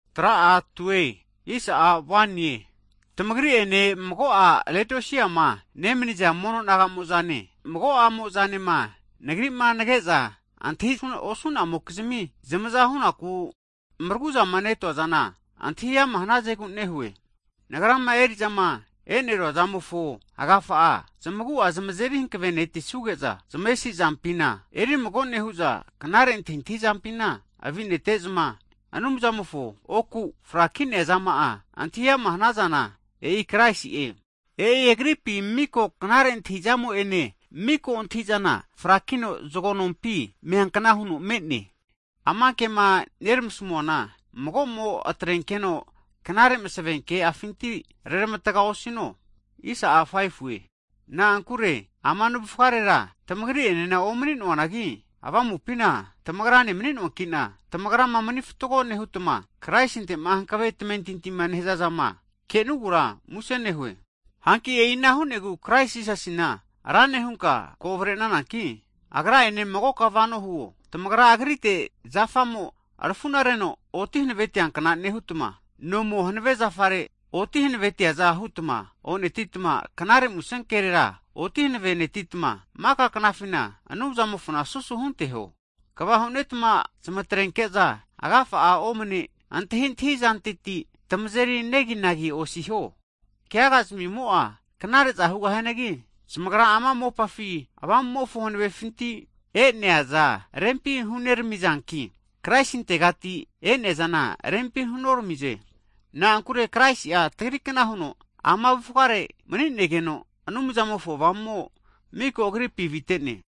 Hagi tamagri'ene mago'a Leodisiama nemaniza mono naga'mo'zane, mago'amozanema nagri'ma nage'za antahi'zama osu'namokizmima zamaza hu'naku maragu'zama netuazana antahi ama' hanazegu nehue. Nagrama eri'zama e'neruazamofo agafa, zamagu'a zamazeri hankavenetisuge'za zmavesizampina erimago nehu'za, knare antahizampina avinetezma, Anumzamofo oku fraki'nea zama'a antahi ama hanazana, e'i Kraisi'e. E'i Agripi miko knare antahintahizamo'ene, miko antahi'zana frakino, zago nompi me'neankna huno me'ne. Ama kema neramasamuana mago'mo atrenkeno knare masevenke'afinti reramatga osino. Na'ankure ama navufgarera tamagri'enena omani'noanagi, avamupina tamagrane mani'noankina tamagrama mani fatgo nehutma Kraisinte'ma hankave tamentinti nehazazama kenugura muse nehue. Hanki e'ina hu'negu Krais Jisasina, Rane huta ko avrenazankita Agra'ene magoka vano hiho. Tamagra Agrite zafamo arafu'nareno oti hanavetiankna nehutma, nomo hanave zafare oti hanavetiaza hutma onetitma, Knare Musenkera oti hanave netitma, maka knafina Anumzamofona susu hunteho. Kva hunetma zamatrenke'za agafa'a omane antahintahi zantetira tamazeri neginagi osiho. Keaga zamimo'a knare'za hugahianagi, zamagra ama mopafi vahemofo antahiza rempi huneramizanki, Kraisintegati enea'zana rempi hunoramize. Na'ankure Kraisi'a tagrikna huno ama avufgare mani'negeno, Anumzamofo avu'avamo'a mika Agripi avite'ne.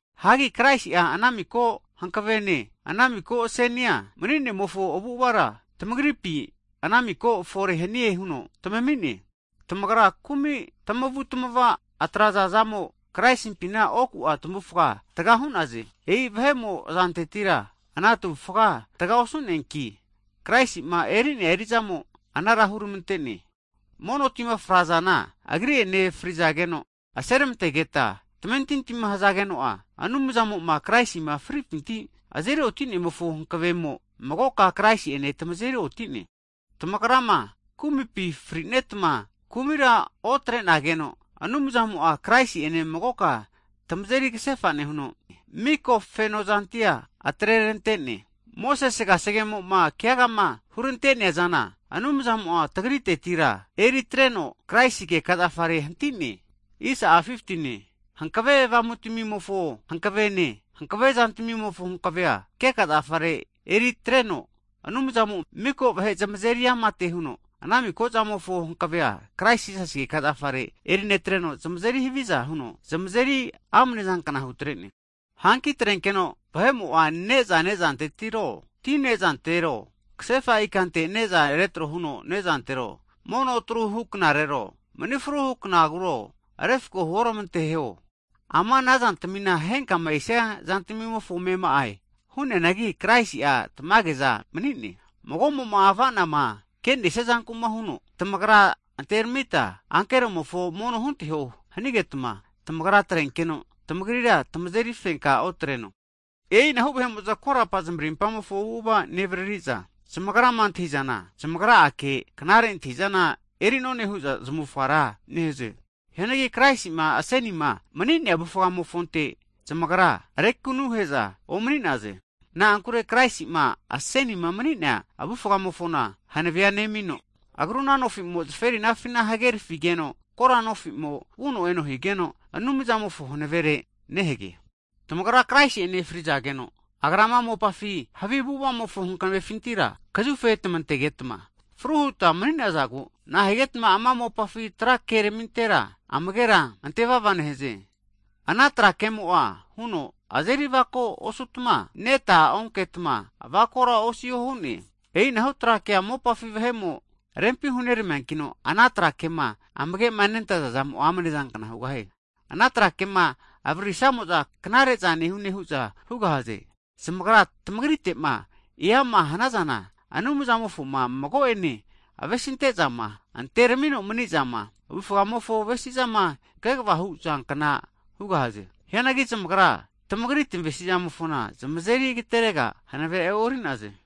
Hagi Kraisi'a ana miko hankavene, ana miko zamofo asenia mani'nemofo avu'avara tamagripi anamiko fore hanie huno tamami'ne. Tamagra kumi tamavutamaza atrazazamo Kraisimpina oku tamavufga taga hu'naze. E'i vahe'mo azantetira ana tamavufga taga osu'neanki, Kraisima eri'nea eri'zamo anara huramante'ne. Mono tima frazana Agri'ene frizageno aseramantegeta tamentintima hazageno'a, Anumzamoma Kraisima fripinti azeri otinemofo hankavemo, magoka Kraisi'ene tamazeri otine. Tamagrama kumipi frinetma, kumira otrenageno, Anumzamo'a Kraisi'ene magoka tamagira tamazeri kasefa nehuno, mika kefozantamia eri atreramante'ne. Mosese kasegemoma keagama huneranteazana Anumzamo'a tagritetira eritreno Kraisi keka zafare hanti'ne. Hankave avamutamimofo hankavene hankave zantamimofo hankavea keka zafare erinetreno, Anumzamo'a miko vahe zamaveri amate huno, ana mikozamofo hankavea Kraisi'a keka zafare eri netreno zamazeri haviza huno zamazeri amnezankna hutre'ne. Hanki atrenkeno vahe'mo'za ne'za nezantero, ti nezantero, kasefa ikante ne'za retro huno nezantero, mono atru huknarero, manifruhu knagura refako huormanteho. Ama anazantamina henkama esia zantamimofo amema'e. Hu'neanagi Kraisi'a tamageza mani'ne. Mago'mo'ma avanama kenesia zankuma huno, tamagra anteramita ankeromofo mono hunteho hanigetma, tamagra atrenenkeno tamagrira tamazeri fenka otreno. E'inahu vahe'mo'za korapa zamarimpamofo avu'ava nevaririza, zamagrama antahi'zana zamagra'ake knare antahi'zana eri'none hu'za zmavufga ra nehaze. Hianagi Kraisi'ma asenima mani'nea avufgamofonte zamagra rekanuhe'za omani'naze. Na'ankure Kraisi'ma asenima mani'nea avufgamofona hanavea nemino, agruna nofi'mo zaferinafi hagenerafigeno kora nofi'mo vuno eno higeno, Anumzamofo hanavere nehage. Hagi tamagra Kraisi'ene frizageno, Agra ama mopafi havi Avamumofo hankavefintira kazufe tamantegetma fru hutma mani'nazagu, nahigetma ama mopafi tra keramintera amagera antevava nehaze. Ana tra kemo'a huno azeri avako osutma, neta onketma, avakora osiho hu'ne! E'inahu tra kea mopafi vahe'mo rempi huneramiankino, ana tra kema amagema nentaza zamo'a amnezankna hugahie. Ana tra kema avaririsamo'za knare'za nehune hu'za hugahaze. Zamagra tamagritema eama hanazana, Anumzamofoma mago'ane avesintezama, anteramino manizama, avufgamofo avesizama kegava hazankna hugahaze. Hianagi zamagra taza huza korapa tamavesizana eri atregara osugahaze.